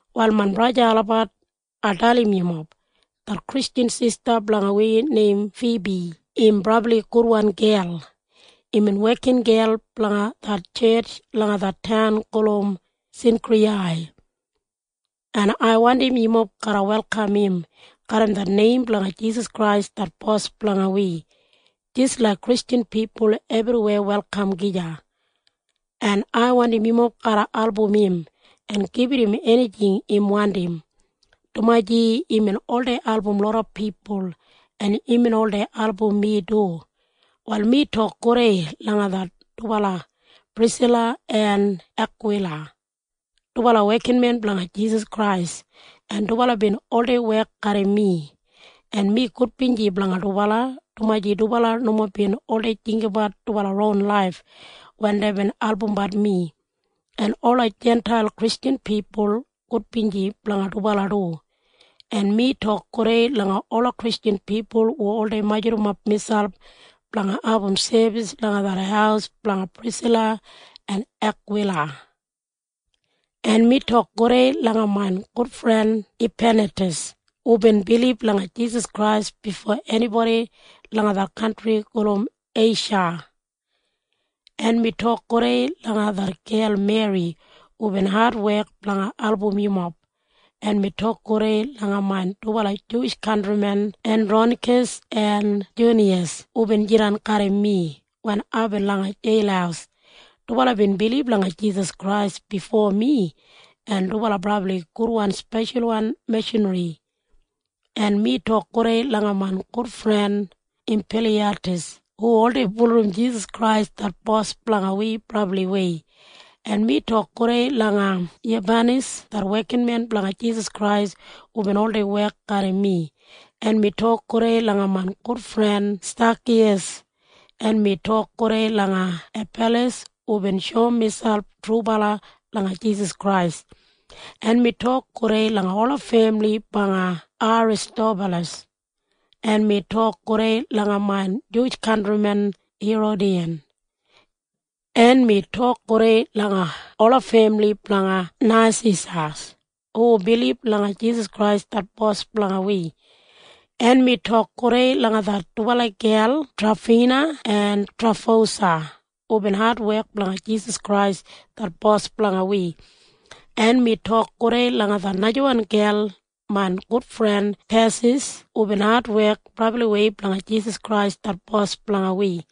Wal main braja en sista olabat, ai dalim yumob. Det Kristjan sista blanga wi neim Fibi im brabli gudwan gel. Imbin wekingel blanga det tjetj langa det taun gulum Sinkriyai. En ai wandim yumob garra welkam im garram det neim blanga Jisas Krais det Bos blanga wi jis laik Kristjan pipul ebriweya welkam gija. En ai wandim yumob garra album im en gibit im enijing im wandim, dumaji imbin oldei album loda pipul, en imbin oldei album mi du. Wal mi tok gudei langa det dubala Prisila en Akwila. Dubala wekinmen blanga Jisas Krais, en dubala bin oldei wek garram mi, en mi gudbinji blanga dubala, dumaji dubala nomo bin oldei jinggabat dubala ron laif wen deibin albumbat mi. En ola Jintail Kristjan pipul gudbinji blanga dubala du. En mi tok gudei langa ola Kristjan pipul hu oldei majurrumap miselp blanga abum sebis langa det haus blanga Prisila en Akwila. En mi tok gudei langa main gudfren Epanetas hubin bilib langa Jisas Krais bifo enibodi langa det kantri gulum Eisha. En mi tok gudei langa det gel Meri hubin adwek blanga album yumob. En mi tok gudei langa main dubala Juwish kantrimen Endronikas en Juniyas hubin jidan garram mi wen aibin langa jeil. Dubala bin bilib langa Jisas Krais bifo mi, en dubala brabli gudwan speshalwan mishanri. En mi tok gudei langa main gudfren Empiliyatas hu oldei bulurrum Jisas Krais det Bos blanga wi brabliwei. En mi tok gudei langa Yubanas det wekinmen blanga Jisas Krais hubin oldei wek garram mi. En mi tok gudei langa main gudfren Stakiyas. En mi tok gudei langa Apeles hubin shoum miselp trubala langa Jisas Krais. En mi tok gudei langa ola femili blanga Aristobalas. En mi tok gudei langa main Juwish kantrimen Herodiyan. En mi tok gudei langa ola femili blanga Nasisas hu bilib langa Jisas Krais det Bos blanga wi. En mi tok gudei langa det dubala gel Trafina en Trafosa hubin adwek blanga Jisas Krais det Bos blanga wi. En mi tok gudei langa det najawan gel main gudfren Pesis hubin adwek brabliwei blanga Jisas Krais det Bos blanga wi.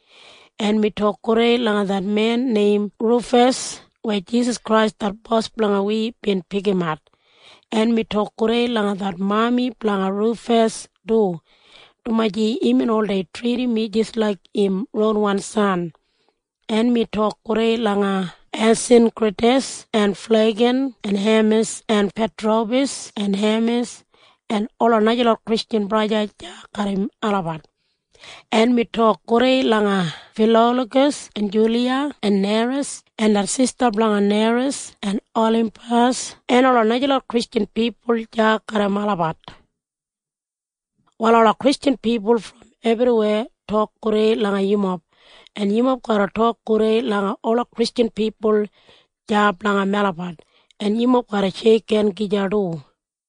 En mi tok gudei langa det men neim Rufas weya Jisas Krais det Bos blanga wi bin pikimat. En mi tok gudei langa det mami blanga Rufas du, dumaji imbin oldei tridim mi jis laik im ronwan san. En mi tok gudei langa Asinkritas en Flegan en Hemis en Patrobas en Hemas en ola najalot Kristjan braja en sista deya garram olabat. En mi tok gudei langa Filologas en Juliya en Neras en det sista blanga Neras en Olimpas en ola najalot Kristjan pipul deya garram olabat. Wal ola Kristjan pipul brom ebriweya tok gudei langa yumob, en yumob garra tok gudei langa ola Kristjan pipul deya blanga melabat. En yumob garra sheikhen gija du.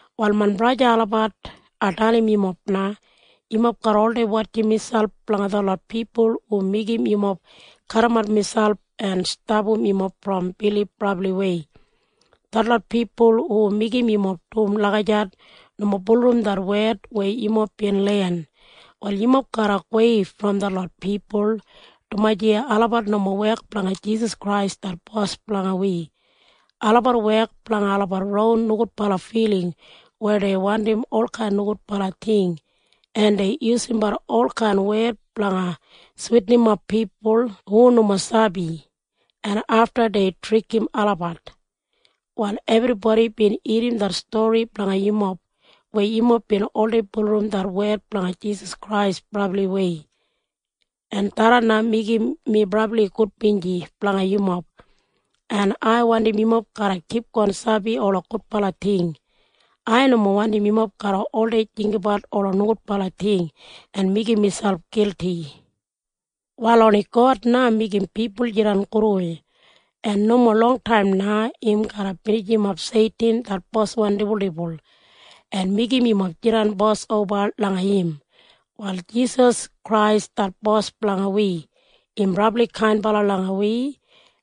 Wal main braja en sista olabat, ai dalim yumob na. Yumob garra oldei wotjim miselp blanga detlot pipul hu meigim yumob kadimat miselp en stapam yumob brom bilib brabliwei. Detlot pipul hu meigim yumob dum lagijat nomo bulurrum det wed weya yumob bin len. Wal yumob garra gowei brom detlot pipul, dumaji olabat nomo wek blanga Jisas Krais det Bos blanga wi. Olabat wek blanga olabat ron nogudbala filing weya dei wandim olkain nogudbala ting, en dei yusumbat olkain wed blanga switinimap pipul hu nomo sabi, en afta dei trikim olabat. Wal ebribodi bin irrim det stori blanga yumob weya yumob bin oldei bulurrum det wed blanga Jisas Krais brabliwei. En tharran meigim mi brabli gudbinji blanga yumob. En ai wandim yumob garra kipgon sabi ola gudbala ting. Ai nomo wandim yumob garra oldei jinggabat ola nogudbala ting en meigim miselp gilti. Wal oni God na meigim pipul jidan gudwei. En nomo longtaim na im garra binijimap Seitin det boswan dibuldibul en meigim yumob jidan bos oba langa im. Wal Jisas Krais det Bos blanga wi im brabli kainbala langa wi,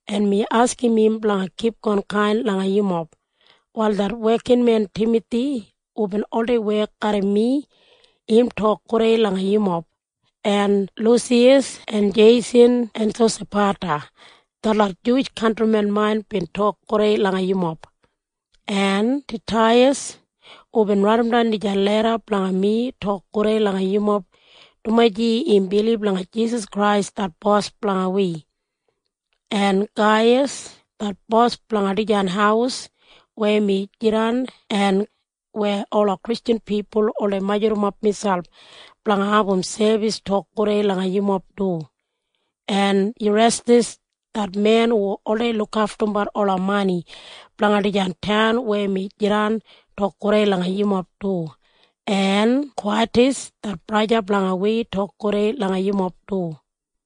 en mi askim im blanga kipgon kain langa yumob. Wal det wekinmen Timathi hubin oldei wek garram mi im tok gudei langa yumob. En Lusiyas en Jeisan en Sosapata detlot Juwish kantrimen main bin tok gudei langa yumob du. En Tetiyas hubin raidimdan dijan leda blanga mi tok gudei langa yumob dumaji im bilib langa Jisas Krais det Bos blanga wi. En Gaiyas det bos blanga dijan haus weya mi jidan en weya ola Kristjan pipul oldei majurrumap miselp blanga abum sebis, tok gudei langa yumob du. En Irestas det men hu oldei lukaftumbat ola mani blanga dijan taun weya mi jidan tok gudei langa yumob du. En Kwatas det braja blanga wi tok gudei langa yumob du.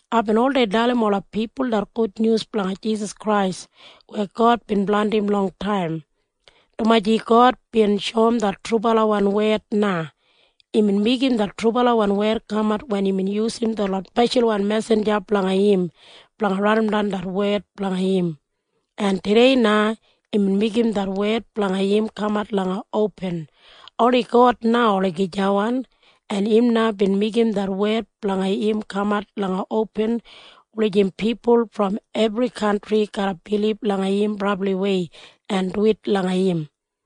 Aibin oldei dalim ola pipul det gudnyus blanga Jisas Krais weya God bin blandim longtaim, dumaji God bin shoum det trubalawan wed na. Imbin meigim det trubalawan wed kamat wen imbin yusum detlot speshalwan mesinja blanga im blanga raidimdan det wed blanga im. En tudei na imbin meigim det wed blanga im kamat langa opin. Oni God na olagijawan, en im na bin meigim det wed blanga im kamat langa opin wulijim pipul brom ebri kantri garra bilib langa im brabliwei en duwit langa im.